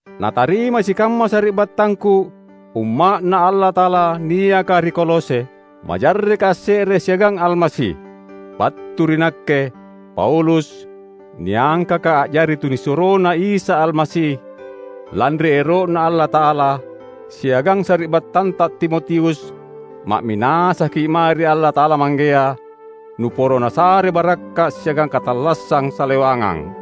Natarimai sikamma sari’battangku, umma’Na Allata’ala niaka ri Kolose, majarreka asse’re siagang Almasi! Battu ri nakke, Paulus, niangkaka a’jari tunisuroNa Isa Almasi, lanri ero’Na Allata’ala, siagang sari’battanta Timotius; ma’minasaki’ mae ri Allata’ala Manggea, nuporo Nasare barakka’ siagang katallassang salewangang.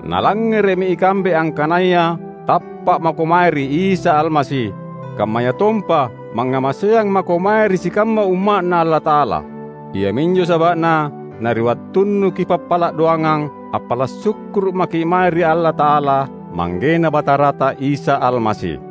Nalangngere’mi ikambe angkanaya tappa’ mako mae ri Isa Almasi; kammayatompa mangngamaseang mako mae ri sikamma Umma’Na Allata’ala. Iaminjo saba’na, na ri wattunnu kipappala’ doangang, appala’ sukkuru’ maki’ mae ri Allata’ala, ManggeNa Batarata Isa Almasi.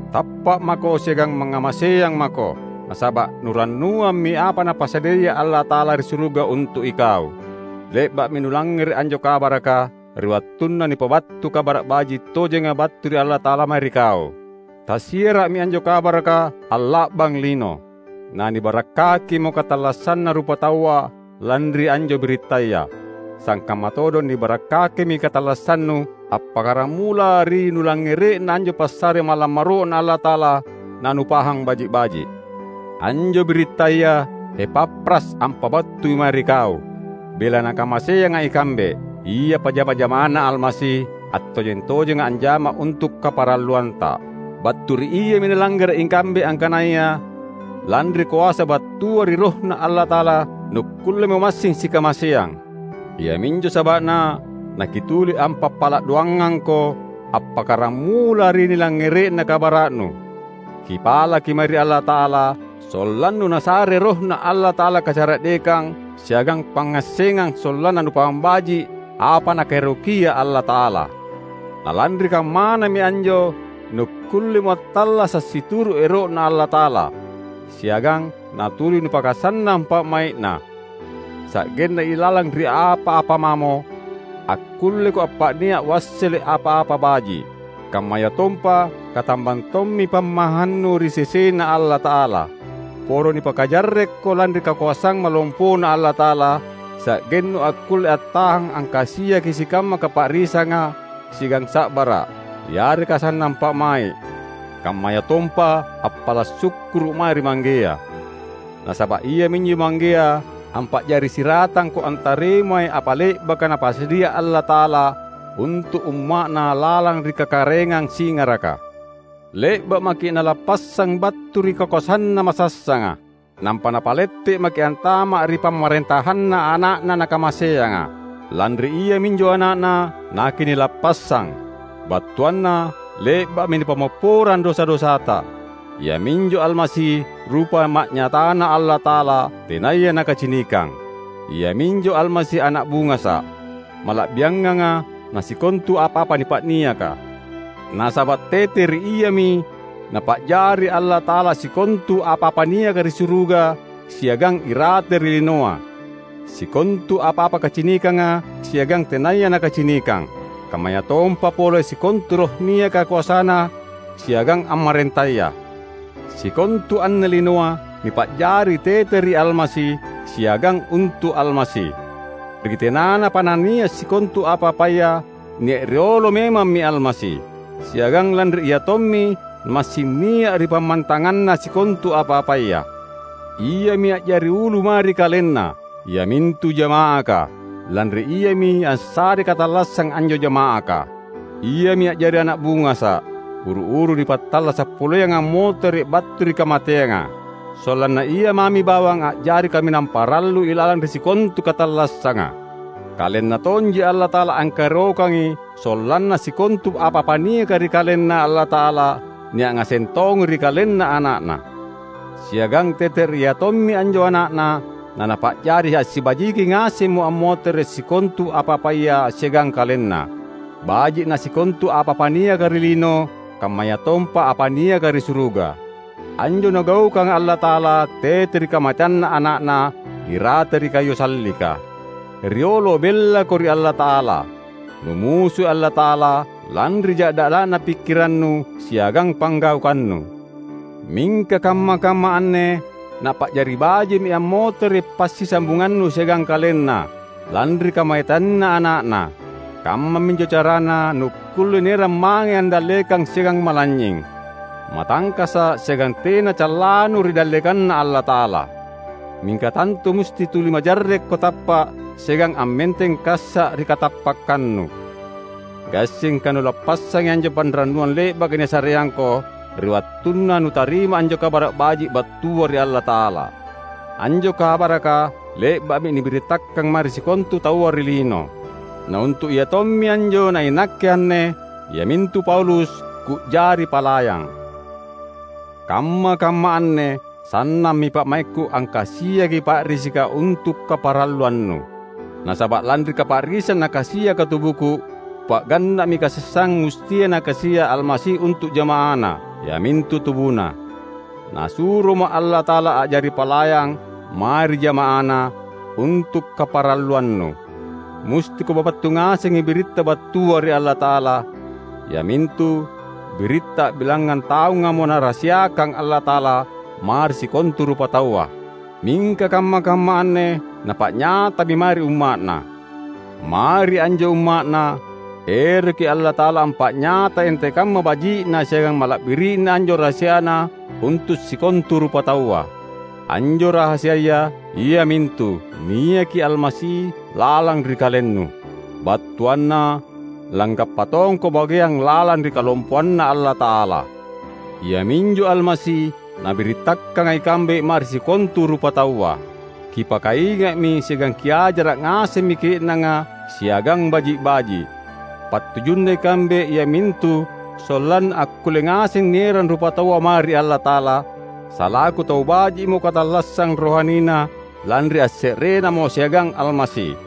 Tappa’ mako siagang mangngamaseang mako, nasaba’ nurannuammi apa Napasadiaya Allata’ala ri suruga untu’ ikau. Le’ba’mi nulangngere’ anjo kabaraka, ri wattunna nipabattu Kabara’ Baji’ tojenga battua ri Allata’ala mae ri kau. Tassiara’mi anjo kabaraka alla’bang lino. Na nibarakkakimo katallassanna rupataua lanri anjo birittaya; sangkamma todong nibarakkakimi katallassannu appakkaramula ri nulangngere’na anjo passare malammoro’Na Allata’ala na nupahang baji’-baji’. Anjo birittaya Epafras ampabattui mae ri kau, bela nakamaseanga ikambe. Ia pajama-jamaNa Almasi, attojeng-tojenga anjama untu’ kaparalluanta. Battu ri iami nalangngere’ ikambe angkanaya lanri koasa battua ri RohNa Allata’ala nukkullemo massing sikamaseang. Iaminjo saba’na nakituli ampappala’ doangangko appakkaramula ri nilangngere’na kabara’nu. Kipalaki mae ri Allata’ala sollannu Nasare RohNa Allata’ala kacara’dekang siagang pangngassengang sollanna nupahang baji’ apa Nakaerokia Allata’ala. Na lanri kammanami anjo nukkullemo attallasa’ situru’ ero’Na Allata’ala, siagang natuli nupakasannang pa’mai’Na; sa’genna ilalang ri apa-apa mamo, akkulleko appa’nia’ wassele’ apa-apa baji’. Kammayatompa katambang tommi pammahannu ri sesena Allata’ala. Poro nipakajarrekko lanri kakoasang malompoNa Allata’ala, sa’gennu akkulle attahang angkasiaki sikamma kapa’risanga siagang sa’bara’, yareka sannang pa’mai’, kammayatompa appala’ sukkuru’ mae ri Manggea. Nasaba’ iaminjo Manggea ampa’jari siratangko antarimai apa le’baka Napasadia Allata’ala untu’ umma’Na lalang ri kakaraengang singaraka. Le’ba’ maki’ Nalappassang battu ri kakoasanna masassanga, nampa napalettekki’ antama’ ri pamarentahanNa Ana’Na Nakamaseanga. Lanri Iaminjo Ana’Na nakinilappassang; battuanna le’ba’mi nipammopporang dosa-dosata. Iaminjo Almasi rupa ma’nyataNa Allata’ala tenaya nakacinikang; iaminjo Almasi ana’ bungasa’, mala’bianganga na sikontu apa-apa nipa’niaka. Nasaba’ tete ri Iami Napa’jari Allata’ala sikontu apa-apa niaka ri suruga siagang irate ri linoa, sikontu apa-apa kacinikanga siagang tenaya nakacinikang; kammayatompa pole sikontu roh niaka koasana siagang ammarentaya. Sikontu anne linoa nipa’jari tete ri Almasi, siagang untu’ Almasi. Ri tenanapa nania’ sikontu apa-apaya, nia’ riolo memammi Almasi. Siagang lanri Ia tommi na massing nia’ ri pammantanganna sikontu apa-apaya. Iami a’jari ulu mae ri KalenNa, iamintu jama’aka; lanri Iami assarei katallassang anjo jama’aka. Iami a’jari ana’ bungasa’, uru-uru nipattallasa’ poleanga ammotere’ battu ri kamateanga; sollanna Ia mami bawang a’jari kaminang parallu ilalang ri sikontu katallassanga. KalenNa tonji Allata’ala angkaerokangi sollanna sikontu apa-apa niaka ri KalenNa Allata’ala, nia’ ngaseng tongi ri KalenNa Ana’Na. Siagang tete ri Ia tommi anjo Ana’Na, naNapa’jari assibajiki ngasemmo ammotere’ sikontu apa-apaya siagang KalenNa — baji’ na sikontu apa-apa niaka ri lino kammayatompa apa niaka ri suruga. Anjo Nagaukanga Allata’ala tete ri kamateanNa Ana’Na irate ri kayu sallika. Riolo bellako ri Allata’ala. Numusui Allata’ala, lanri ja’dala’na pikkirannu siagang panggaukannu. Mingka kamma-kamma anne, Napa’jari baji’mi ammotere’ passisambungannu siagang KalenNa, lanri kamateanNa Ana’Na. Kammami anjo carana nukkulle nierang mange andallekang siagang malanynying, matangkasa’ siagang tena callanu ri dallekanNa Allata’ala. Mingka tantu musti tuli majarrekko tappa’ siagang ammenteng kassa’ ri katappakkannu. Gassingka nulappassangi anjo panrannuang le’baka nisareangko ri wattunna nutarima anjo Kabara’ Baji’ battua ri Allata’ala. Anjo kabaraka le’ba’mi nibirittakang mae ri sikontu taua ri lino. Na untu’ iatommi anjo nainakke anne, iamintu Paulus, ku’jari palayang. Kamma-kamma anne sannammi pa’maikku angkasiaki pa’risika untu’ kaparalluannu. Nasaba’ lanri kapa’risang nakasiaka tubuku, kupa’ganna’mi kasessang mustia Nakasia’ Almasi untu’ jama’aNa, iamintu tubuNa. Nasuroma’ Allata’ala a’jari palayang mae ri jama’aNa untu’ kaparalluannu. Musti kupabattu ngasengi biritta battua ri Allata’ala; iamintu biritta a’bilangngang taungamo Narahasiakang Allata’ala mae ri sikontu rupataua, mingka kamma-kamma anne Napa’nyatami mae ri umma’Na. Mae ri anjo umma’Na, eroki Allata’ala ampa’nyatai antekamma baji’na siagang mala’biri’na anjo rahasiaNa untu’ sikontu rupataua. Anjo rahasiaya, iamintu: Niaki Almasi lalang ri kalennu; battuanna langgappa tongko bageang lalang ri kalompoanNa Allata’ala. Iaminjo Almasi nabirittakanga ikambe mae ri sikontu rupataua. Kipakainga’mi siagang kiajara’ ngasemmi ke’nanga siagang baji’-baji’. Pattujunna ikambe iamintu sollanna akkulle ngaseng nierang rupataua mae ri Allata’ala, salaku tau baji’mo katallassang rohanina, lanri asse’renamo siagang Almasi.